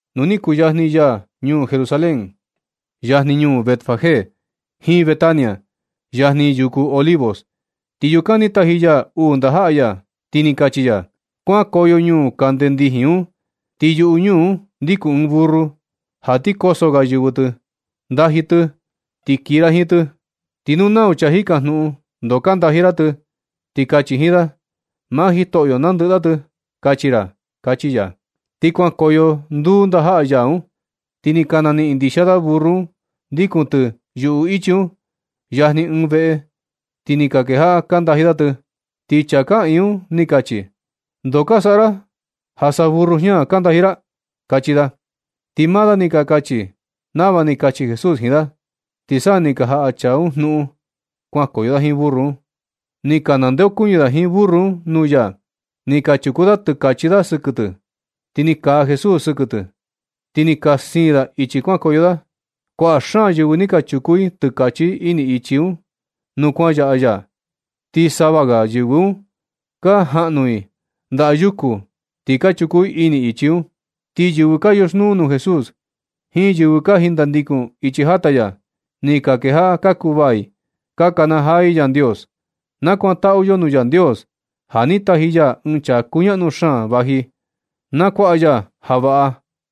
Nu ni kuyajni ya ñuu Jerusalén, yajni ñuu Betfagé jiin Betania, yajni yuku Olivos, Ti yukan ni taji ya uu ndajaꞌa ya, ti ni kachi ya: ―Kuankoyo ñuu kande ndijin un. Ti yuꞌu ñuu un ndiku ɨɨn burru, ja ti koso ga yɨvɨ tɨ. Ndaji tɨ ti kii ra jiin tɨ. Ti nu nau chaa jikajnuꞌun ndoo ka ndaji ra tɨ, ti kachi jiin da “Maa Jitoꞌyo nandɨꞌɨ da tɨ”, kachi ra ―kachi ya. Ti kuankoyo nduu ndajaꞌa ya un, ti ni ka naniꞌin ndixia da burru un ndikun tɨ yuꞌu ichi un, yajni ɨɨn veꞌe. Ti ni ka kejaꞌa ka ndaji da tɨ. Ti ɨɨn chaa kaꞌiin un ni kachi: ―¿Ndoo ka saꞌa ra, ja sa burru jña ka ndaji ra? ―kachi da. Ti maa da ni ka kachi da nava ni kachi Jesús jiin da, ti sa ni ka jaꞌa chaa un jnuꞌun kuankoyo da jiin burru un. Ni ka nandeokuñɨ da jiin burru un nuu ya. Ni ka chuku da tɨkachi da sɨkɨ tɨ, ti ni kaa Jesús sɨkɨ tɨ, ti ni ka siin da ichi kuankoyo da. Kuaꞌa xaan yɨvɨ ni ka chuku i tɨkachi i ini ichi un nuu kuan yaꞌa ya. Ti sava ga yɨvɨ un ka jaꞌnu i ndayuku ti ka chuku i ini ichi un. Ti yɨvɨ ka yoxnuu nuu Jesús jiin yɨvɨ ka jindandikun ichi jata ya, ni ka kejaꞌa ka kuvaa i, ka kanajaa i Yandios: ―Na kutaꞌu yo nuu Yandios, ja ni taji ya ɨɨn chaa kuñaꞌnu xaan vaji, nakuaꞌa ya ja vaꞌa da.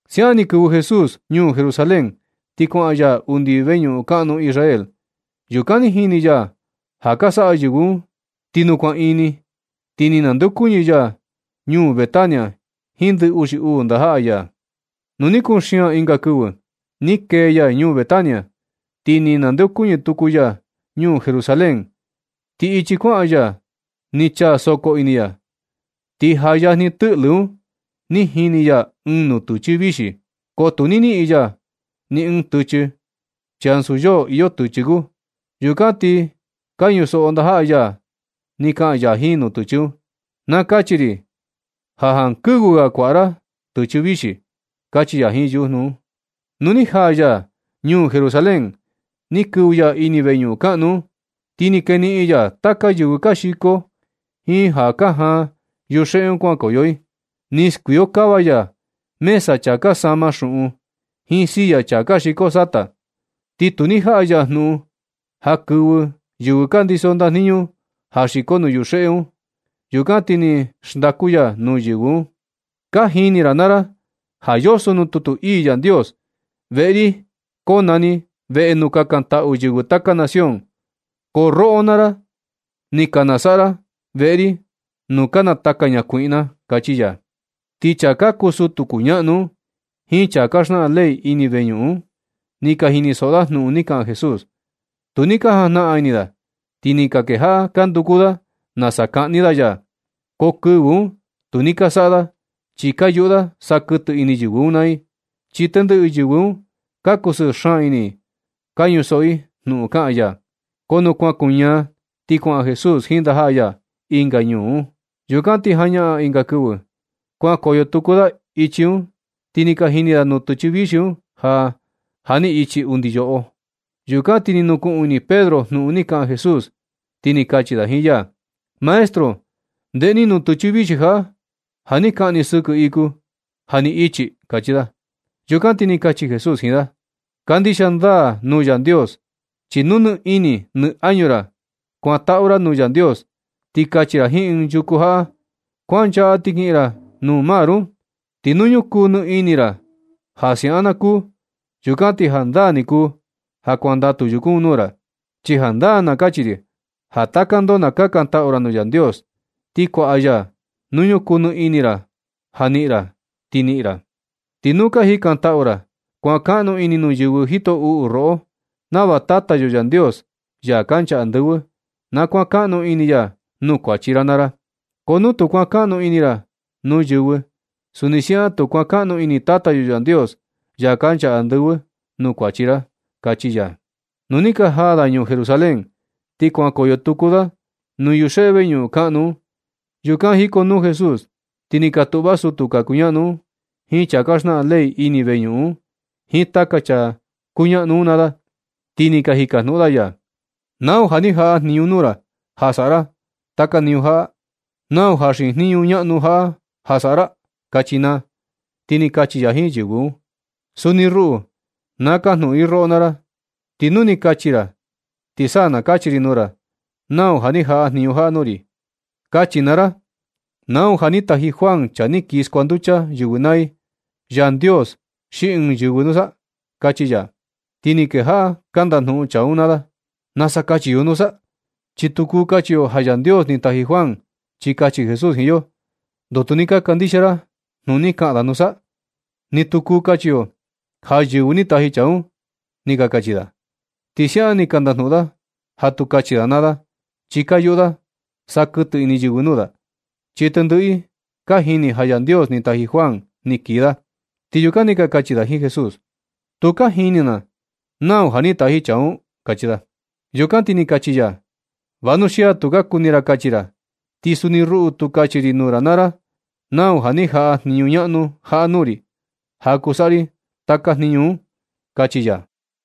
Siaꞌan ni kɨvɨ Jesús ñuu Jerusalén. Ti kuaꞌan ya undi veñuꞌun kaꞌnu Israel. Yukan ni jini ya taka ja ka saꞌa yɨvɨ un. Ti nu kuan ini, ti ni nandeokuñɨ ya ñuu Betania jiin ndɨ uxi uu ndajaꞌa ya. Nu ni kuxian ɨnga kɨvɨ, ni kee ya ñuu Betania, ni nandeokuñɨ tuku ya ñuu Jerusalén, ti ichi kuaꞌan ya ni chaa sokō ini ya. Ti jaa yajni tɨꞌlɨ un ni jini ya ɨɨn nutɨchɨ vixi, ko tu ni niꞌin ya ni ɨɨn tɨchɨ, chi ansu yoo iyo tɨchɨ kuu. Yukan ti ka ñusoꞌo ndajaꞌa ya ni kaꞌan ya jiin nutɨchɨ un: ―¡Na kachi ri ja jankɨvɨ ga kuaꞌa ra tɨchɨ vixi! ―kachi ya jiin yujnu un. Nu ni jaa ya ñuu Jerusalén, ni kɨvɨ ya ini veñuꞌun kaꞌnu un, ti ni keniꞌin ya taka yɨvɨ ka xiko jiin ja ka jaan yuxeꞌe un kuankoyo i. Ni skuiokava ya mesa chaa ka sama xuꞌun, jiin silla chaa ka xiko sata. Ti tu ni jaꞌa ya jnuꞌun ja kɨvɨ yɨvɨ ka ndiso ndajniñu ja xiko nuu yuxeꞌe un. Yukan ti ni xndaku ya nuu yɨvɨ un: ―Ka jini ra naa ra ja yoso nuu tutu ii Yandios: “Veꞌe ri konani veꞌe nuu kakantaꞌu yɨvɨ taka nación.” Ko roꞌo naa ra ni ka nasaꞌa ra veꞌe ri nuu ka nataka ñakuiꞌna ―kachi ya. Ti chaa ka kuu sutu kuñaꞌnu un jiin chaa ka xnaꞌan ley ini veñuꞌun un, ni ka jinisoꞌo da jnuꞌun ni kaꞌan Jesús. Tu ni ka jajnaꞌan ini da. Ti ni ka kejaꞌa ka nduku da nasa kaꞌni da ya. Ko kɨvɨ un tu ni ka saꞌa da, chi ka yuꞌu da sa kɨtɨ ini yɨvɨ un naa i, chi tendɨꞌɨ yɨvɨ un ka kusɨɨ xaan ini i ka ñusoꞌo jnuꞌun kaꞌan ya. Ko nu kuan kuñaa, ti kuaꞌan Jesús jiin ndajaꞌa ya ɨnga ñuu un. Yukan ti jañaꞌan ɨnga kɨvɨ, kuankoyo tuku da ichi un, ti ni ka jini da nutɨchɨ vixi un ja, ja ni ichi undi yoꞌo. Yukan ti ni nukuꞌun ini Pedro jnuꞌun ni kaꞌan Jesús, ti ni kachi da jiin ya: ―Maestro, ndeꞌe ni nutɨchɨ vixi jaꞌa, ja ni kaꞌan ni sɨkɨ iku, ja ni ichi ―kachi da. Yukan ti ni kachi Jesús jiin da: ―Kandixia ndaa nuu Yandios. Chi nu nɨ ini nɨ añu ra na kakantaꞌu ra nuu Yandios, ti kachi ra jiin ɨɨn yuku jaꞌa: “Kuanchaꞌa ti kiꞌin ra nuu mar un”, ti nu ñukuu nɨ ini ra ja siaꞌan na kuu, yukan ti jandaa ni kuu ja kuandatu yuku un nuu ra. Chi jandaa na kachi ri ja taka ndoo na kakantaꞌu ra nuu Yandios, ti kuaꞌa ya nu ñukuu nɨ ini ra ja niꞌin ra, ti niꞌin ra. Ti nu ka jikantaꞌu ra, kuankaꞌnu ini nuu yɨvɨ jito uꞌu roꞌo, nava Tata yo Yandios, ya kancha andɨvɨ, na kuankaꞌnu ini ya nuu kuachi ra naa ra. Ko nu tu kuankaꞌnu ini ra nuu yɨvɨ, suni siaꞌan tu kuankaꞌnu ini Tata yo Yandios, ya kancha andɨvɨ, nuu kuachi ra ―kachi ya. Nu ni ka jaa da ñuu Jerusalén, ti kuankoyo tuku da nuu yuxeꞌe veñuꞌun kaꞌnu un. Yukan jikonuu Jesús ti ni ka tuꞌva sutu ka kuñaꞌnu, jiin chaa ka xnaꞌan ley ini veñuꞌun un, jiin taka chaa kuñaꞌnu un naa da. Ti ni ka jikajnuꞌun da ya: ―¿Nau ja ni jaꞌa jniñu nuu ra ja saꞌa ra taka jniñu jaꞌa? ¿Nau ja xiin jniñu ñaꞌnu jaꞌa ja saꞌa ra? ―kachi naa. Ti ni kachi ya jiin yɨvɨ un: ―Suni ruꞌu na kajnuꞌun ri roꞌo naa ra, ti nu ni ka kachi ra, ti sa na kachi ri nuu ra nau ni jaꞌa jniñu jaꞌa nuu ri. Kachi naa ra: ¿Nau ja ni taji Juan, chaa ni kii skuanducha yɨvɨ naa i, Yandios xi ɨɨn yɨvɨ nusa? ―kachi ya. Ti ni kejaꞌa ka ndajnuꞌun chaa un naa da: ―¿Nasa kachi yo nusa? Chi tu kuu kachi yo ja Yandios ni taji Juan chi kachi Jesús jiin yo: “¿Ndoo tu ni ka kandixia ra jnuꞌun ni kaꞌan da nusa?” Ni tu kuu kachi yo ja yɨvɨ ni taji chaa un ―ni ka kachi da. Ti siaꞌan nɨ ka ndajnuꞌun da ja tu kachi da naa da, chi ka yuꞌu da sa kɨtɨ ini yɨvɨ nuu da, chi tendɨꞌɨ i ka jini ja Yandios ni taji Juan ni kii da. Ti yukan ni ka kachi da jiin Jesús: ―Tu ka jini na nau ja ni taji chaa un ―kachi da. Yukan na ti ni kachi ya: ―Vanuxia tu ka kuni ra kachi ra, ti suni ruꞌu tu kachi ri nuu ra naa ra nau ja ni jaꞌa jniñu ñaꞌnu jaꞌa nuu ri, ja kuu saꞌa ri taka jniñu un ―kachi ya.